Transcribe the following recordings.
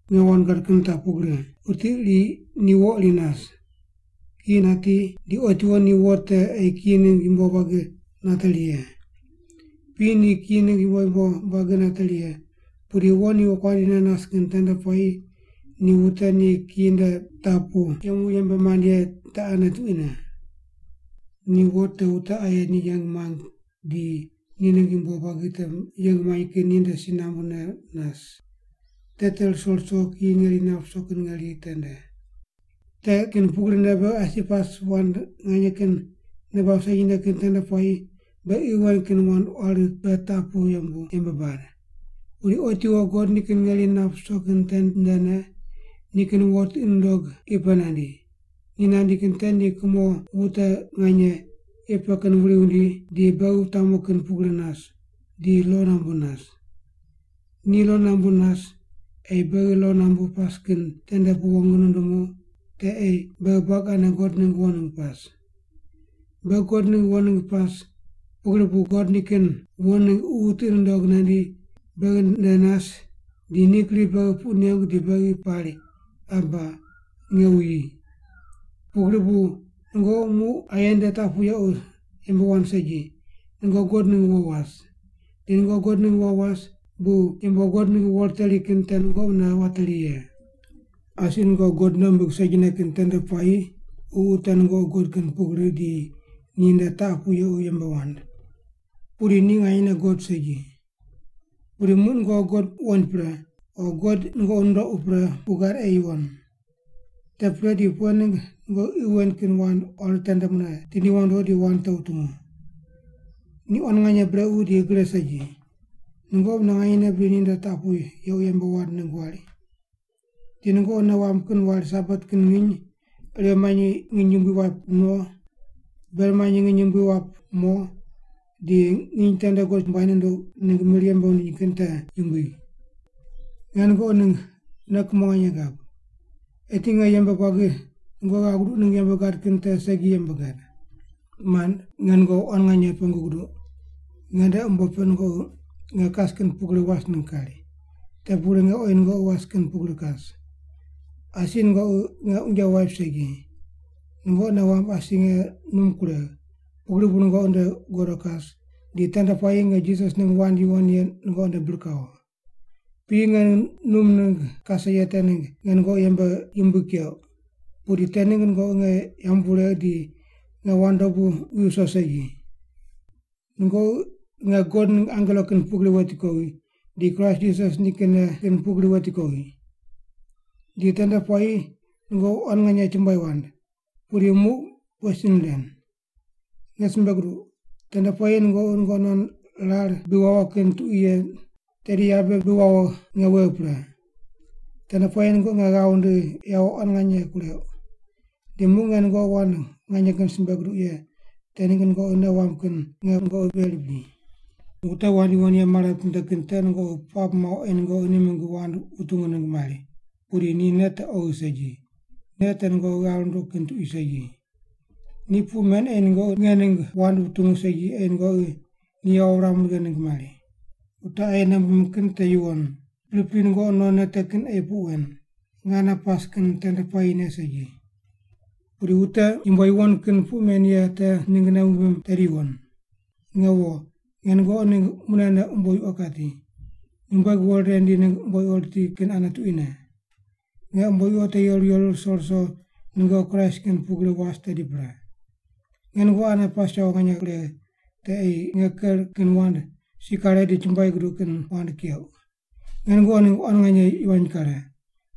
Nge wand gad kin taq pugri, wuti iri ni wo iri nas. Kiyi nati di otiwo ni wo te ei kiyi ningg yumbo buagi nateri ye. Piyi ni kiyi ningg yumbo yumbo buagi nateri ye, pudi wo ni wokuandi ne nas kin tende puayi ni wute ni kiyi nde taq pu yemu yembe mand ye te ane tuquine. Ni wo te wute aye ni yeng muang di ni ningg yumbo buagi te yeng muany kin ninde si nambune nas. Te te ruso ruso kiyi ngeri nap ruso kin ngeri tende. Te kin pugrine beghi asi pas wand nganye kin nei bab segine kin tende puayi beghi qi wen kin wand quari pe taq pu yembu yembe bad. Pudi otiwo God nikin ngeri nap ruso kin tendene ni nikin wo tiqi nundog qi pe nandi. Ni nandi kin te ni kumo wute nganye qi pe kin wuri wundi di beghi wutamu kin pugri nas, di lo nambu nas. Ni lo nambu nas, ei beghi lo nambu pas kin tende pu wong nundumu te ei beghi buagi ane God ningg wo ningg pas. Beghi God ningg wo ningg pas, pugri bu God nikin wo ningg Ququ tiqi nundog nandi beghi nde nas di ni gri beghi puq nengu di beghi pari, “Aba, nge wuyi.” Pugri bu nungoqi muq aye nde taq pu yequ yembe wand segi, nungoqi God ningg wo was. Di nungoqi God ningg wo was bu yumbo God ningg wo riteri kin te nungoqi mune wateri ye. Asi nungoqi God nei wumbig segine kin tende puayi ququ te nungoqi god kin pugri di ninde taq pu yequ yembe wand. Pudi ni nganyene god segi. Pudi muq nungoqi God wuqoind pre, o God nungoqi nundoqu pre puq gad ei yuwon. Te pre di pughe ningg nungoqi qi wen kin wand quari tende mune tindi wondo di wand te wutungu? Ni quan nganye brequ di gre segi. Nungoqi mune nganye bri ninde taq pu yequ yembe wand ningg wari? Di nungoqi nei wamb kin wari Sabat kin nginy, irew manyi nginy yumbui waip no, ber manyi nginy yumbui wap mo di nginy tende God chumbuai nunduq ningg mir yembe wundiny kin te yumbui. Nge nungoqi ningg nei kumo nganye gab. Eti nge yembe buagi nungoqi ghav guduq ningg yembe gad kin te segi yembe gad. Mand, nge nungoqi quan nganye pengu guduq, nge nde umbo pe nungoqi nge kas kin pugri was ningg kari. Te pugri nge oyi nungoqi was kin pugri kas. Asi nungoqi nge unje waip segi. Nungoqi nei wamb asi nge num kuregh, pugri bu nungoqi nde godo kas, di tende puayi nge Jisas ningg wand yuwon ye nungoqi nde bir kawo. Piyi nge num ningg kase ye te ningg nge nungoqi yembe yumbui keuq, pudi te ningg nungoqi nge yambu wuregh di nge wand dobu wi viso segi. Nungoqi nge God ningg angelo kin pugri weti kowi, di Kraist Jisas nikinne kin pugri weti kowi. Di tende puayi nungoqi quan nganye chumbuai wand. Pudi muq pughe sin ren? Nge simbe guduq, tende puayi nungoqi nungoqi non rar bi wawo kin tuqui ye tedi yabe bi wawo nge wegh pre. Tende puayi nungoqi nge ghav wundigh yawo quan nganye kureuq. Di muq nge nungoqi wand nganye kin simbe guduq ye te ningg nungoqi nei wamb kin nge nungoqi veri bri? Wute wand yuwon ye mare mitinde kin te nungoqi puamb muauq ei nungoqi ni mingg wand wutungu ningg mari, pudi ni nei te oghi segi, nei te nungoqi ghav runduq kin tuqui segi. Ni puq men ei nungoqi nge ningg wand wutungu segi ei nungoqi ni yawo wuram righe ningg mari. Wute aye nei wumbim kin te yuwon, pripri nungoqi nonne te kin ei puq wen, nge ane pas kin tende puayine segi. Pudi wute yumbo yuwon kin puq men ye te ningg nei wumbim tedi yuwon. Nge wo, nge nungoqi ningg munene umbo yuqo kati, nyumbueg wo rire rindi ningg umbo yuqo riti kin ane tuquine. Nge umbo yuqo te yeru yeru ruso ruso nungoqi Kraist kin pugrine was tedi pre. Nge nungoqi ane pas yawo nganye kuregh te ei nge ker kin wand si kare di chumbuai guduq kin wand keuq. Nge nungoqi ningg quan nganye yivany kare,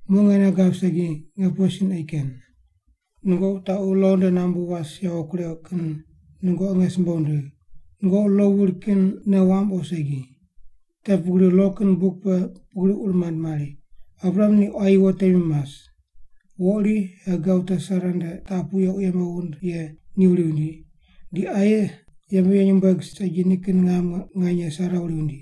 muq nge nei gab segi nge pughe sin ei ken. Nungoqi wutaqu lo nde nambu was yawo kureuq kin nungoqi nge simbe wundigh, nungoqi lo wuri kin nei wamb o segi? Te pugri lo kin buk pe pugri ur mand mari, Abraham ni quayi wo temi mas. Wo iri Hagar wute Sara nde taq pu yequ yembe wund ye ni wuri wundi, di aye yembe ye nyumbueg segi nikin ngam nganye Sara wuri wundi.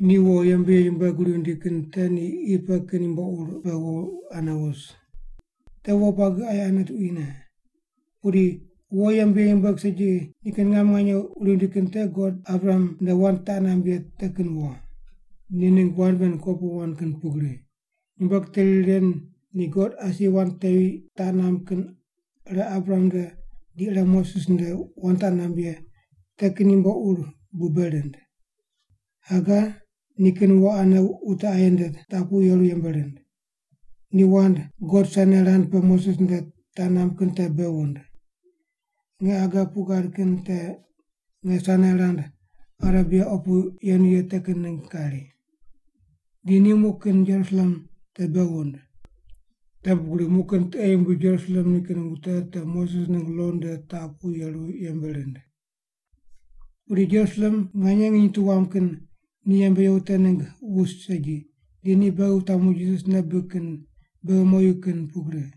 Ni wo yembe ye nyumbueg wuri wundi kin te ni qi pe kin yumbo ur pe wo ane wus. Te wo buagi aye ane tuquine. Pudi wo yembe ye nyumbueg segi nikin ngam nganye wuri wundi kin te God Abraham nde wand taq namb ye te kin wo. Ni ningg wand ven kopuqu wand kin pugri. Nyumbueg teri ren ni God asi wand tevi taq namb kin ire Abraham nde di ire Moses nde wand taq namb ye te kin yumbo ur bu bei rind. Hagar nikin wo ane wute aye nde taq pu yeru yembe rind. Ni wand God Sainai rand pe Moses nde taq namb kin te bei wund. Nge Hagar puq gad kin te nge Sainai rand Arebia opu yenu ye te kin ningg kari. Di ni muq kin Jerusalem te bei wund. Te pugri muq kin tiqe yumbui Jerusalem nikin wute te Moses ningg lo nde taq pu yeru yembe rind. Pudi Jerusalem nganye nginy tu wam kin ni yembe ye wute ningg wus segi, di ni beghi wutamu Jisas nei bibig kin beghi moyu kin pugri.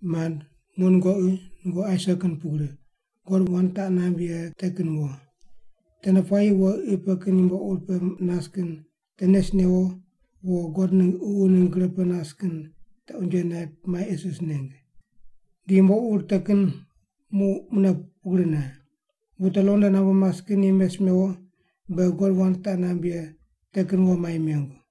Mand, muq nungoqi, nungoqi Aisak kin pugri, God wand taq namb ye te kin wo. Tende puayi wo qi pe kin yumbo ur pe nas kin te nes newo wo God ningg Ququ ningg gre pe nas kin te unje naip mai isis neng. Di yumbo ur te kin muq mune pugrine. Wute lo nde nambu mas kin ni mes mewo beghi God wand taq namb ye te kin wo mai mengu.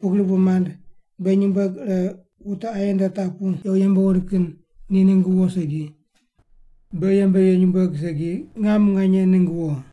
Pugri bu, mand, beghi nyumbueg ire wute aye nde taq pu yequ yembe wund kin ni ningg wo segi, beghi yembe ye nyumbueg segi ngam nganye ningg wo.